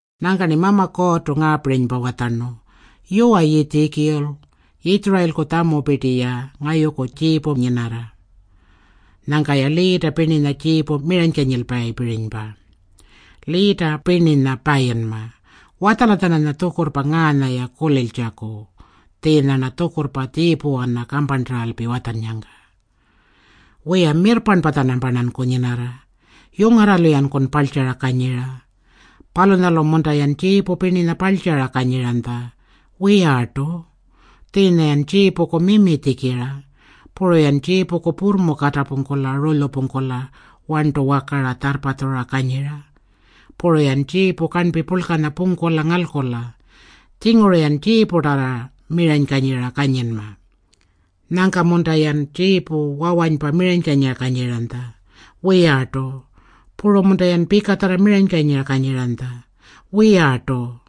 Nyangka-rni Mama Kuurrtu ngaapirinypa watjarnu, “Yuwa Yiitjikul, Yitjurayilku tjamupirti-ya ngayuku tjiipu nyinarra. Nyangka-ya liita pirninya tjiipu miranykanyilpayipirinypa. Liita pirninya payinma. Watjala-tjananya tjukurrpa ngaanya-ya kuliltjaku tjiinya-rna tjukurrpa tjiipuwana kamparntaralpi watjannyangka, Wiya, mirrparnpa-tjanamparnanku nyinarra. Yungarralu-yankun parltjara kanyira. Palunyalu-munta-yan tjiipu pirninya parltjara kanyiranytja? Wiyartu. Tjiinya-yan tjiipuku mimi tjikira. Puru-yan tjiipuku purrmu katapungkula rulyupungkula warntu wakara tjarrpatjura kanyira. Puru-yan tjiipu karnpi purlkanya pungkula ngalkula. Tjinguru-yan tjiiputarrartu miranykanyira kanyinma. Nyangka-munta-yan tjiipu wawanypa miranykanyira kanyiranytja? Wiyartu. Puru-munta-yan pikatjarra miranykanyira kanyiranytja? Wiyartu.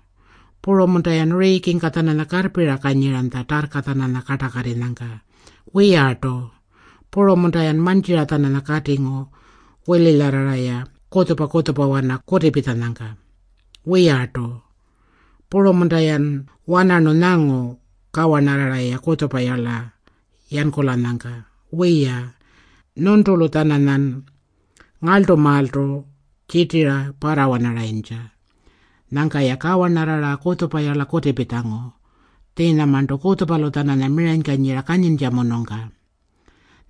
Puru-munta-yan riikingka-tjananya karrpira kanyiranytja tarrka-tjananya kartakatirranyangka? Wiyartu. Puru-munta-yan mantjira-tjananya katingu wililyarrara-ya kutjupa-kutjupawana kutipitjanyangka? Wiyartu. Puru-munta-yan wanarnu nyangu kawarnarrara-ya kutjupayarla yankulanyangka? Wiya, nyuntulu-tjananyan ngarltumaaltu tjirtira parrawanaranytja. Nyangka-ya kawarnarrara kutjupayarla kutipitjangu, tjiinyamarntu kutjupalu-tjananya miranykanyira kanyiranytjamunungka.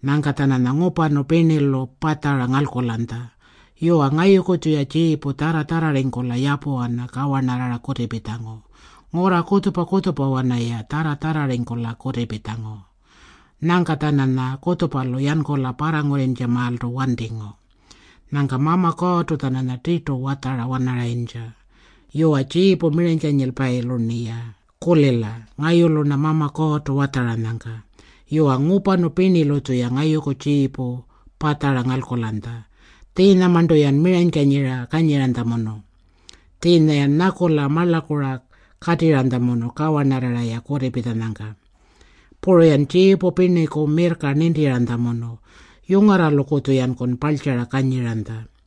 Nyangka-tjananya ngupanu pirnilu patjara ngalkulanytja. Yuwa, ngayuku-tjuya tjiipu tjarra-tjarrarringkula yapuwana kawarnarrara kutipitjangu. Ngurra kutjupa-kutjupawana-ya tjarra-tjarrarringkula kutipitjangu. Nyangka-tjananya kutjupalu yankula parrangurrintjamaaltu wantingu.” Nyangka Mama Kuurrtu-tjananya tirtu watjara-wanarayintja, Yuwa, tjiipu miranykanyilpayilu-rniya kulila ngayulu-rna Mama Kuurrtu watjaranyangka. Yuwa, ngupanu pirnilu-tjuya ngayuku tjiipu patjara ngalkulanytja. Tjiinyamarntu-yan miranykanyira kanyiranytjamunu. Tjiinya-yan nyakula marlakura katirranytjamunu kawarnarrara-ya kutipitjanyangka. Puru-yan tjiipu pirniku mirrka nintiranytjamunu. Yungarralukutju-yankun parltjara kanyiranytja.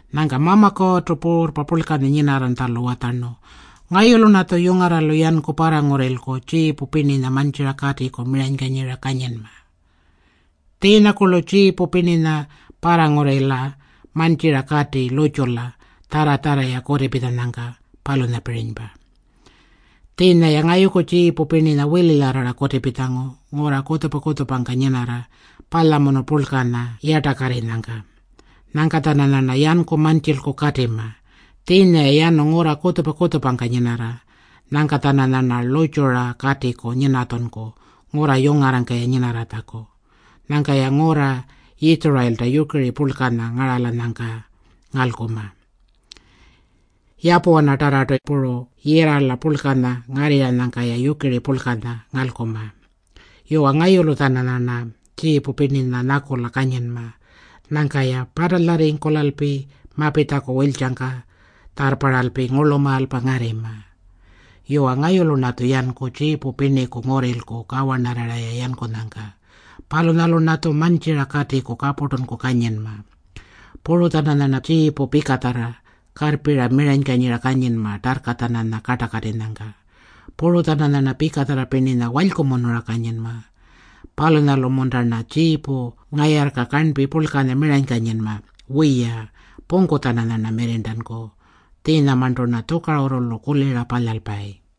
Nyangka Mama Kuurrtu Puurrpa Purlkanya nyinarranytjalu watjarnu, Ngayulu-rnatju yungarralu yanku parrangurrilku tjiipu pirninya mantjira katiku miranykanyira kanyinma. Tjiinyakurlu tjiipu pirninya parrangurrila mantjira kati lurrtjula tjarra-tjarra-ya kutipitjanyangka, palunyapirinypa. Tjiinya-ya ngayuku tjiipu pirninya wililyarrara kutipitjangu ngurra kutjupa-kutjupangka nyinarra palyamunu purlkanya yartakarrinyangka. Nyangka-tjananyarna yanku mantjilku katima. Tjiinya-ya yanu ngurra kutjupa-kutjupangka nyinarra. Nyangka-tjananyarna lurrtjura katiku nyinatjunku ngurra yungarrangka-ya nyinarratjaku. Nyangka-ya ngurra Yitjurayilta yukiri purlkanya ngaralanyangka ngalkuma. Yapuwanatarrartu puru yirrala purlkanya ngarrirranyangka-ya yukiri purlkanya ngalkuma. Yuwa, ngayulu-tjananyarna tjiipu pirninya nyakula kanyinma. Nyangka-ya patalyarringkulalpi mapitjaku wiltjangka tjarrparralpi ngurlumaalpa ngarrima. Yuwa, ngayulu-rnatju yanku tjiipu pirniku ngurrilku kawarnarrara-ya yankunyangka. Palunyalu-rnatju mantjira katiku kapurtunku kanyinma. Puru-tjananyarna tjiipu pikatjarra karrpira miranykanyira kanyinma tarrka-tjananya kartakatinyangka. Puru-tjananyarna pikatjarra pirninya walykumunura kanyinma. Palunyalu-munta-rna tjiipu ngayarrka karnpi purlkanya miranykanyinma? Wiya, pungku-tjananyarna mirrirntanku. Tjiinyamarntu-rna tjukarurrulu kulira palyalpayi.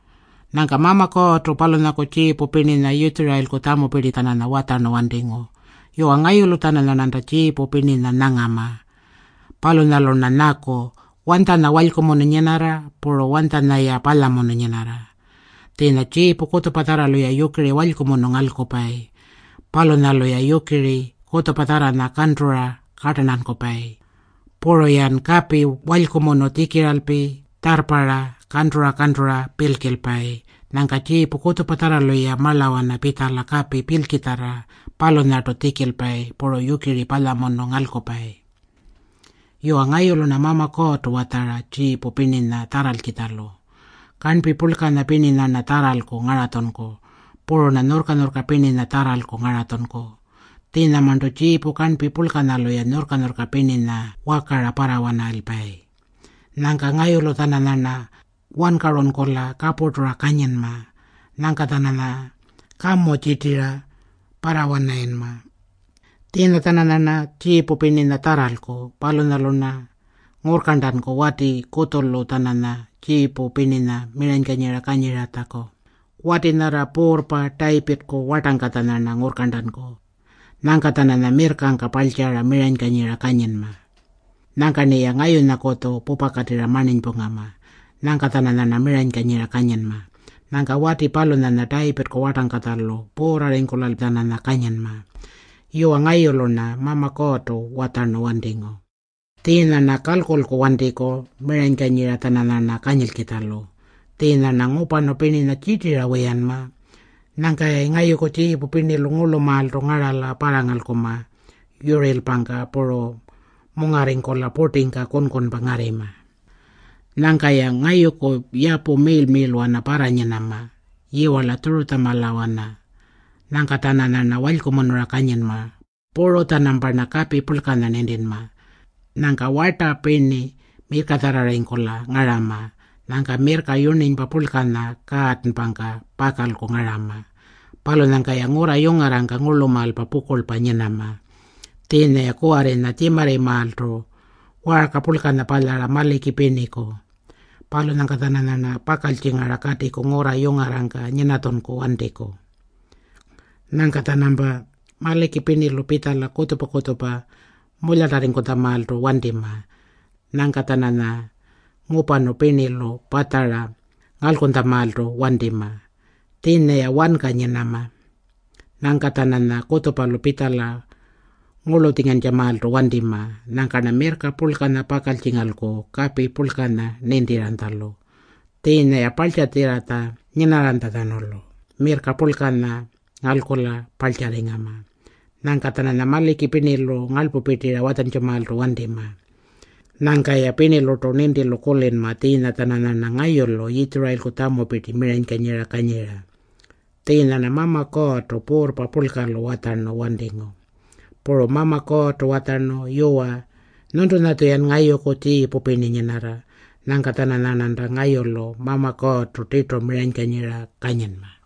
Nyangka Mama Kuurrtu palunyaku tjiipu pirninya Yitjurayilku tjamupirti-tjananya watjarnu wantingu, Yuwa, ngayulu-tjananyarnanta tjiipu pirninya nyangama. Palunyalu-rna nyaku, “Wanytjanya walykumunu nyinarra puru wanytjanya-ya palyamunu nyinarra?” Tjiinya tjiipu kutjupatjarralu-ya yukiri walykumunu ngalkupayi. Palunyalu-ya yukiri kutjupatjarranya kantura kartarntankupayi. Puru-yan kapi walykumunu tjikiralpi tjarrparra kantura-kantura pilkilpayi. Nyangka tjiipu kutjupatjarralu-ya marlawana pitjala kapi pilkitjarra palunyartu tjikilpayi puru yukiri palyamunu ngalkupayi. Yuwa, ngayulu-rna Mama Kuurrtu watjara tjiipu pirninya tjarralkitjalu. Karnpi purlkanya pirninya-rna tjarralku ngaratjunku. Puru-rna nyurrka-nyurrka pirninya tjarralku ngaratjunku. Tjiinyamarntu tjiipu karnpi purlkalu-ya nyurrka-nyurrka pirninya wakara parrawanalpayi. Nyangka ngayulu-tjananyarna wankarunkula kapurtura kanyinma. Nyangka-tjananya kamu tjirtira parrawanarayinma. Tjiinya-tjananyarna tjiipu pirninya tjarralku. Palunyalu-rna ngurrkarntanku wati kutjulu-tjananya tjiipu pirninya miranykanyira kanyiratjaku. Wati nyarra puurrpa Tayipirrku wartangkatja-rna ngurrkarntanku. Nyangka-tjananya mirrkangka parltjara miranykanyira kanyinma. Nyangka-rniya ngayunyakutju pupakatirra marninypungama. Nyangka-tjananyarna miranykanyira kanyinma. Nyangka wati palunyanya Tayipirrku wartangkatjalu puurrarringkula-tjananya kanyinma. Yuwa, ngayulu-rna Mama Kuurrtu watjarnu wantingu. Tjiinya-rna kalkulku wantiku miranykanyira-tjananyarna kanyilkitjalu. Tjiinya-rna ngupanu pirninya tjirtira wiyanma. Nyangka-yayi ngayuku tjiipu pirnilu ngurlumaaltu ngarala parrangalkunma yurirlpangka palunyalu mungarringkula purtingka kunkunpa ngarrima. Nyangka-ya ngayuku yapu miirl-miirlwana parranyinama, yiwarla Tjurutjamalawana. Nyangka-tjananyarna walykumunura kanyinma. Puru-tjanamparna kapi purlkanya nintinma. Nyangka warta pirni mirrkatjarrarringkula ngarama. Nyangka mirrka yurninypa purlkanya kaatanpangka pakalku ngarama. Palunyangka-ya ngurra yungarrangka ngurlumaalpa pukurlpa nyinama. Tjiinya-ya kuwarrinya tjimarrimaaltu waarka purlkanya palyara maliki pirniku. Palunyangka-tjananyarna pakaltjingara katiku ngurra yungarrangka nyinatjunku wantiku. Nyangka-tjanampa maliki pirnilu pitjala kutjupa-kutjupa mulyatarringkutjamaaltu wantima. Nyangka-tjananya ngupanu pirnilu patjara ngalkunytjamaaltu wantima. Tjiinya-ya wanka nyinama. Nyangka-tjananya kutjupalu pitjala ngurlutjingantjamaaltu wantima. Nyangka-rna mirrka purlkanya pakaltjingalku kapi purlkanya nintiranytjalu. Tjiinya-ya parltjatjirratja nyinarranytjatjanulu mirrka purlkanya ngalkula parltjarringama. Nyangka-tjananya maliki pirnilu ngarlpupirtira watjantjamaaltu wantima. Nyangka-ya pirnilurtu nintilu kulinma tjiinya-tjananyarna ngayulu Yitjurayilku tjamupirti miranykanyira kanyira. Tjiinya-rna Mama Kuurrtu Puurrpa Purlkalu watjarnu wantingu. Puru Mama Kuurrtu watjarnu, “Yuwa, nyuntulu-tjuyan ngayuku tjiipu pirni nyinarra. Nyangka-tjananyarnanta ngayulu Mama Kuurrtu tirtu miranykanyira kanyinma.”